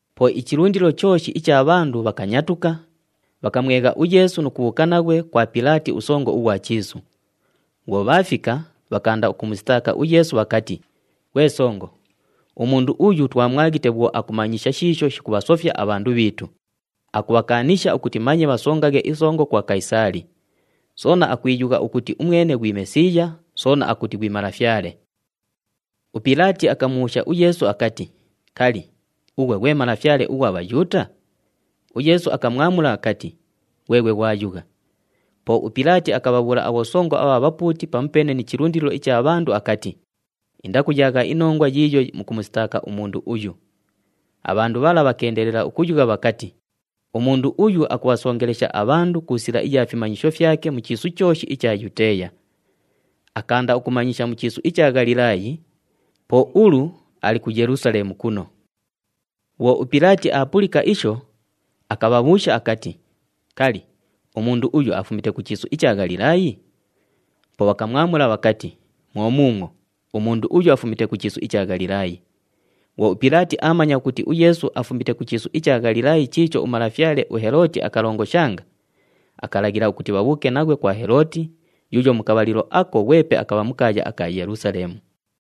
Po ichilundilo chooshi icha bhandu bhakanyatuka, bhakamwegha uYeesu nu kubhuuka naghwe kwa Pilaati usongo ughwa chiisu. Bhwo bhaafika, bhakaanda ukumusitaaka uYeesu bhakati, “Ghwe songo, umundu uyu twamwaghite bhwo akumanyisha shiisho shikubhasofya abhandu bhiitu, akubhakaanisha ukuti manye bhasongaghe isongo kwa Kayisaali. Soona akwiyugha ukuti umwene ghwi Mesiiya, soona akuti ghwi Malafyale.” UPilaati akamubhuusha uYeesu akati, “Kali, ughwe ghwe Malafyale ughwa Bhayuuta?” UYeesu akamwamula akati, “Ghweghwe ghwayugha.” Po uPilaati akabhabhuula abhosongo abha bhapuuti pamupeene ni chilundilo icha bhandu akati, “Indakuyaagha inongwa yiiyo mukumusitaaka umundu uyu.” Abhandu bhala bhakeendelela ukuyugha bhakati, “Umundu uyu akubhasongelesha abhandu ku sila iya fimanyisho fyake mu chiisu chooshi icha Yuteeya. Akaanda ukumanyisha mu chiisu icha Ghalilaayi, po ulu ali ku Yelusaleemu kuno.” Bhwo uPilaati aapulika isho, akabhabhuusha akati, “Kali, umundu uyu afumite ku chiisu icha Ghalilaayi?” Po bhakamwamula bhakati, “Mwo muumwo, umundu uyu afumite ku chiisu icha Ghalilaayi.” Bhwo uPilaati aamanya ukuti uYeesu afumite ku chiisu icha Ghalilaayi chiicho umalafyale uHelooti akalongoshanga, akalaghila ukuti bhabhuuke naghwe kwa Helooti yuuyo mu kabhalilo ako ghwepe akabha mu kaaya aka Yelusaleemu.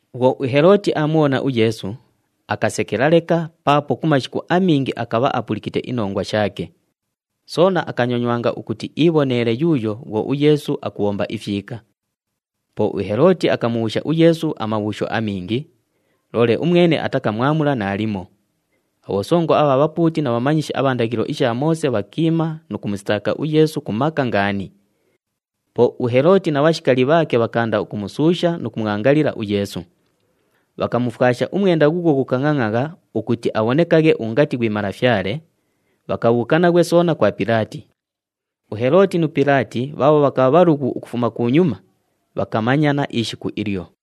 Bhwo uHelooti aamubhona uYeesu, akasekela leka paapo ku mashiku amingi akabha apulikite inongwa shaake. Soona akanyonywanga ukuti iibhonele yuuyo bhwo uYeesu akubhomba ifyika. Po uHelooti akamubhuusha uYeesu amabhuusho amingi, loole umwene atakaamula naalimo. Abhosongo abha bhapuuti na bhamanyishi abha ndaghilo isha Moose bhakiima nu kumusitaaka uYeesu ku maka ngaani. Po uHelooti na bhashikali bhaake bhakaanda ukumusuusha nu kumwangalila uYeesu. Bhakamufwasha umwenda ghuughwo ghukangʼangʼagha ukuti abhonekaghe ungati ghwi malafyale, bhakabhuuka naghwe soona kwa Pilaati. UHelooti nu Pilaati bhaabho bhakabha bhalughu ukufuma kunyuma, bhakamanyana ishiku ilyo.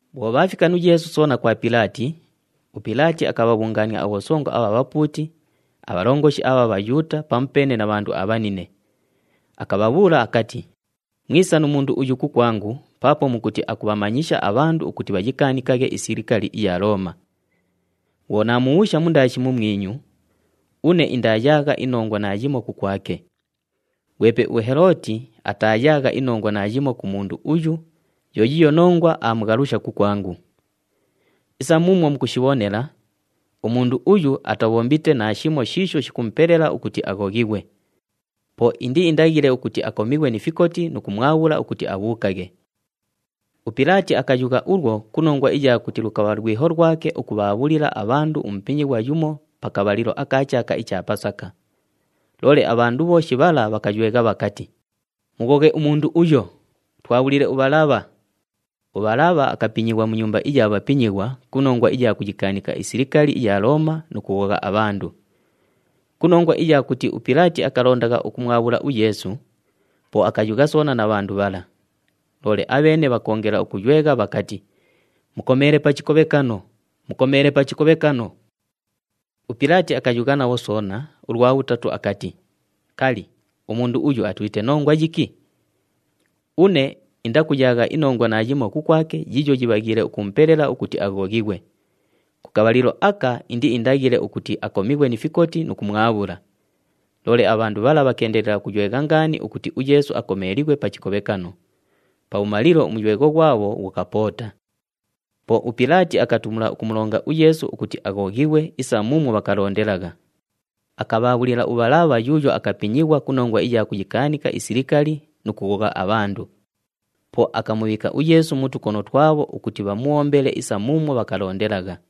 Bhwo bhaafika nu Yeesu soona kwa Pilaati, uPilaati akabhabhungaania abhosongo abha bhapuuti, abhalongoshi abha Bhayuuta pamupeene na bhandu abhanine. Akabhabhuula akati, “Mwisa nu mundu uyu kukwangu paapo mukuti akubhamanyisha abhandu ukuti bhayikaanikaghe isilikali iya Looma. Bhwo naamubhuusha mundaashi mumwinyu, une indaayaagha inongwa naayimo kukwake. Ghwepe uHelooti ataayaagha inongwa naayimo ku mundu uyu, yo yiiyo nongwa aamughalusha kukwangu. Isa muumwo mukushibhonela, umundu uyu atabhombite naashimo shiisho shikumupelela ukuti aghoghighwe. Po indiindaghile ukuti akomighwe ni fikoti nu kumwabhula ukuti abhuukaghe.” [ UPilaati akayugha ulwo ku nongwa iya kuti lukabha lwiho lwake ukubhaabhulila abhandu umupinyighwa yumo pa kabhalilo aka chaaka icha Pasaka.] Loole abhandu bhooshi bhala bhakaywegha bhakati, “Mughoghe umundu uyo! Twabhulile uBhalabha!” UBhalabha akapinyighwa mu nyumba iya bhapinyighwa ku nongwa iya kuyikaanika isilikali iya Looma nu kughogha abhandu. Ku nongwa iya kuti uPilaati akalondagha ukumwabhula uYeesu, po akayugha soona na bhandu bhala. Loole abheene bhakoongela ukuywegha bhakati, “Mukomeele pa chikobhekano! Mukomeele pa chikobhekano!” UPilaati akayugha nabho soona ulwa bhutatu akati, “Kali, umundu uyu atulite nongwa yiki? Une indakuyaagha inongwa naayimo kukwake yiiyo yibhaghiile ukumupelela ukuti aghoghighwe. Ku kabhalilo aka indiindaghile ukuti akomighwe ni fikoti nu kumwabhula.” Loole abhandu bhala bhakeendelela ukuywegha ngaani ukuti uYeesu akomeelighwe pa chikobhekano. Pabhumalilo umuywegho ghwabho ghukapoota. Po uPilaati akatumula ukumulonga uYeesu ukuti aghoghighwe isa muumwo bhakalondelagha. Akabhaabhulila uBhalabha yuuyo akapinyighwa ku nongwa iya kuyikaanika isilikali nu kughogha abhandu. Po akamubhiika uYeesu mu tukono twabho ukuti bhamubhombele isa muumwo bhakalondelagha.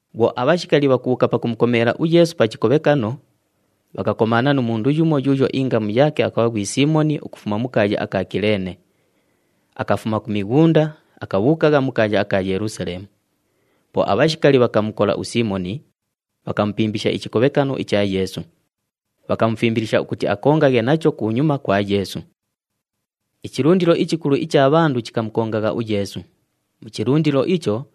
Bhwo abhashikali bhakubhuuka pakumukomeela uYeesu pa chikobhekano, bhakakomaana nu mundu yumo yuuyo ingamu yaake akabha ghwi Siimoni ukufuma mu kaaya aka Kileene. Akafuma ku mighunda, akabhuukagha mu kaaya aka Yelusaleemu. Po abhashikali bhakamukola uSiimoni, bhakamupimbisha ichikobhekano icha Yeesu. Bhakamufimbilisha ukuti akongaghe nacho kunyuma kwa Yeesu. Ichilundilo ichikulu icha bhandu chikamukongagha uYeesu. Mu chilundilo icho,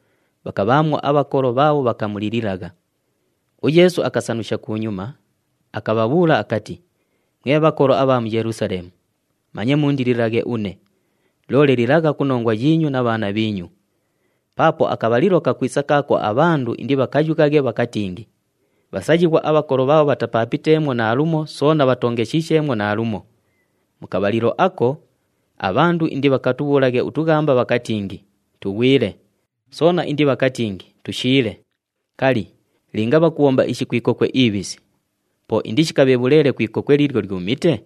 bhakabhaamwo abhakolo bhaabho bhakamulililagha. UYeesu akasanusha kunyuma, akabhabhuula akati, “Mwe bhakolo abha mu Yelusaleemu, manye mundililaghe une, loole lilagha ku nongwa yiinyu na bhaana bhiinyu! Paapo akabhalilo kakwisa kaako abhandu indibhakayughaghe bhakatingi, ‘Bhasayighwa abhakolo bhaabho bhatapaapiteemwo naalumo soona bhatoongeshisheemwo naalumo!’ Mu kabhalilo ako, ‘Abhandu indibhakatubhuulaghe utughamba bhakatingi, “Tughwile!” Soona indibhakatingi, “Tushiile.” ’ “Kali, linga bhakubhomba ishi ku ikokwe ibhisi, po indishikabhe bhuleele ku ikokwe liilyo lyumite?”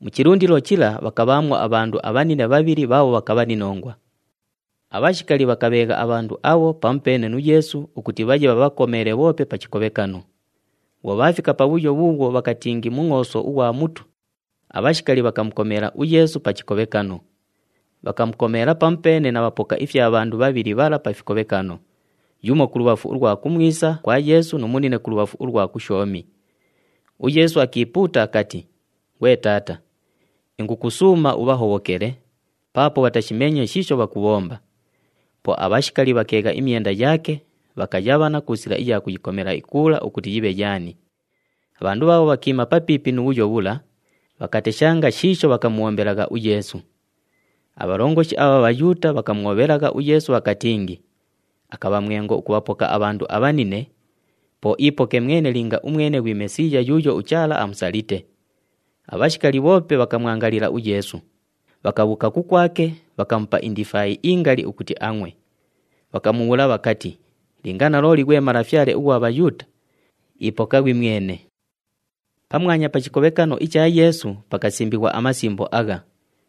Mu chilundilo chila bhakabhaamwo abhandu abhanine bhabhili bhaabho bhakabha ni nongwa. Abhashikali bhakabheegha abhandu abho pamupeene nu Yeesu ukuti bhaye bhabhakomeele bhoope pa chikobhekano. Bhwo bhaafika pabhuyo bhuubhwo bhakatingi Mungʼooso ughwa Mutu, abhashikali bhakamukomeela uYeesu pa chikobhekano. Bhakamukomeela pamupeene na bhapoka ifya bhandu bhabhili bhala pa fikobhekano, yumo kulubhafu ulwa kumwisa kwa Yeesu nu munine kulubhafu ulwa kushoomi. UYeesu akiipuuta akati, “Ghwe Taata, ingukusuuma ubhahobhokele, paapo bhatashimeenye shiisho bhakubhomba.” Po abhashikali bhakeegha imyenda yaake, bhakayabhana ku sila iya kuyikomela ikuula ukuti yibhe yaani. Abhandu bhaabho bhakiima papiipi nu bhuyo bhula, bhakateshanga shiisho bhakamubhombelagha uYeesu. Abhalongoshi abha Bhayuuta bhakamwobhelagha uYeesu bhakatingi, “Akabha mwengo ukubhapoka abhandu abhanine, po iipoke mwene linga umwene ghwi Mesiiya yuuyo uChaala amusalite!” Abhashikali bhoope bhakamwangalila uYeesu, bhakabhuuka kukwake, bhakamupa indifaayi ingali ukuti angʼwe. Bhakamubhuula bhakati, “Linga nalooli ghwe Malafyale ughwa Bhayuuta, ipoka ghwimwene!” Pamwanya pa chikobhekano icha Yeesu pakasimbighwa amasimbo agha,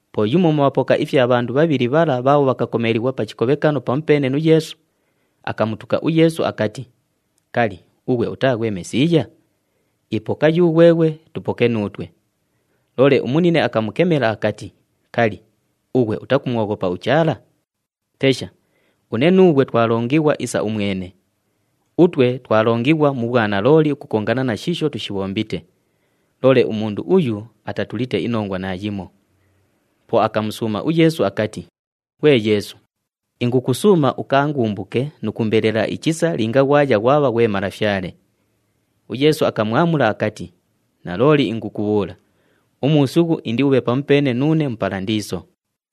Po yumo mu bhapoka ifya bhandu bhabhili bhala bhaabho bhakakomeelighwa pa chikobhekano pamupeene nu Yeesu, akamutuka uYeesu akati, “Kali, ughwe utaa ghwe Mesiiya? Ipoka yughweghwe, tupoke nuutwe!” Loole umunine akamukemela akati, “Kali, ughwe utakumwoghopa uChaala? Tesha, une nuughwe twalongighwa isa umwene! Utwe twalongighwa mu bhwanalooli ukukongana na shiisho tushibhombite. Loole umundu uyu atatulite inongwa naayimo.” Po akamusuuma uYeesu akati, “Ghwe Yeesu, ingukusuuma, ukaangumbuke nu kuumbelela ichisa linga ghwaya ghwabha ghwe Malafyale.” UYeesu akamwamula akati, “Nalooli ingukubhuula, umuusughu indiubhe pamupeene nuune mu Palandiiso.”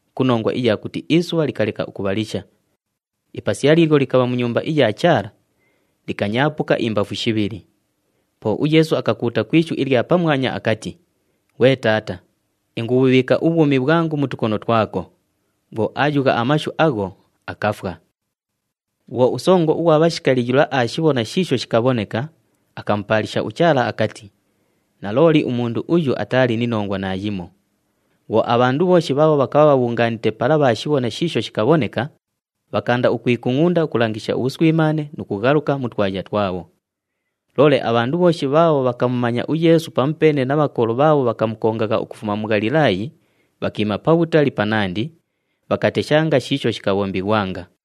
ku nongwa iya kuti isubha likaleka ukubhalisha. Ipasiya liilyo likabha mu Nyumba iya Chaala, likanyaapuka imbafu shibhili. Po uYeesu akakuuta ku ishu ilya pamwanya akati, “Ghwe Taata! Ingubhubhiika ubhwumi bhwangu mu tukono twako.” Bhwo aayugha amashu agho, akafwa. Bhwo usongo ughwa bhashikali yula aashibhona shiisho shikabhoneka, akamupaalisha uChaala akati, “Nalooli, umundu uyu ataali ni nongwa naayimo!” Bhwo abhandu bhooshi bhaabho bhakabha bhabhungaanite pala bhaashibhona shiisho shikabhoneka, bhakaanda ukwikungʼunda ukulangisha ubhuswimaane nu kughaluka mu twaya twabho. Loole abhandu bhooshi bhaabho bhakamumanya uYeesu pamupeene na bhakolo bhaabho bhakamukongagha ukufuma ku Ghalilaayi bhakiima pabhutali panandi, bhakateshanga shiisho shikabhombighwanga.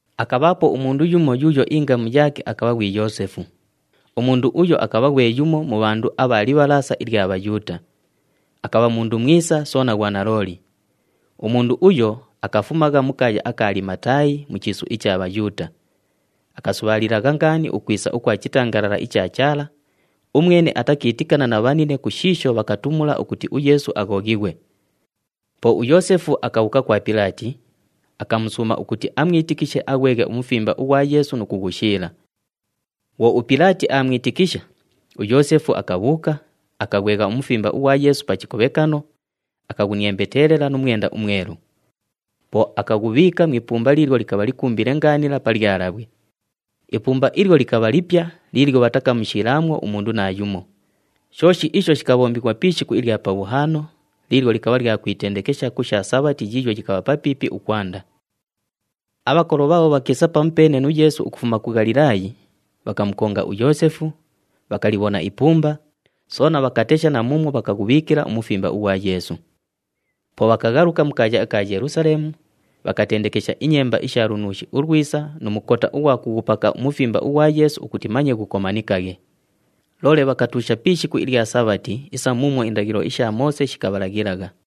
Akabhaapo umundu yumo yuuyo ingamu yaake akabha ghwi Yoosefu. Umundu uyo akabha ghwe yumo mu bhandu abha Libhalaasa ilya Bhayuuta. Akabha mundu mwisa soona ghwanalooli. Umundu uyo, akafumagha mu kaaya aka Alimataayi mu chiisu icha Bhayuuta. Akasubhaalilagha ngaani ukwisa ukwa chitangalala icha Chaala (umwene atakiitikana na bhanine ku shiisho bhakatumula ukuti uYeesu aghoghighwe). Po uYoosefu akabhuuka kwa Pilaati, akamusuuma ukuti amwitikishe aghweghe umufimba ughwa Yeesu nu kughushiila. Bhwo uPilaati aamwitikisha, uYoosefu akabhuuka, akaghwegha umufimba ughwa Yeesu pa chikobhekano, akaghuniembetelela nu mwenda umwelu. Po akaghubhiika mu ipumba liilyo likabha likumbile ngaanila pa lyalabhwe. Ipumba ilyo likabha lipya liilyo bhatakamushiilaamwo umundu naayumo. Shooshi isho shikabhombighwa pi ishiku ilya Pabhuhaano, liilyo likabha lya kwitendekesha ku sha Sabhati yiiyo yikabha papiipi ukwanda. Abhakolo bhaabho bhakiisa pamupeene nu Yeesu ukufuma ku Ghalilaayi, bhakamukonga uYoosefu, bhakalibhona ipumba, soona bhakatesha na muumwo bhakaghubhiikila umufimba ughwa Yeesu. Po bhakaghaluka mu kaaya aka Yelusaleemu, bhakatendekesha inyemba isha lunuushi ulwisa nu mukota ughwa kughupaka umufimba ughwa Yeesu ukuti manye ghukomanikaghe. Loole bhakatuusha pi ishiku ilya Sabhati isa muumwo indaghilo isha Moose shikabhalaghilagha.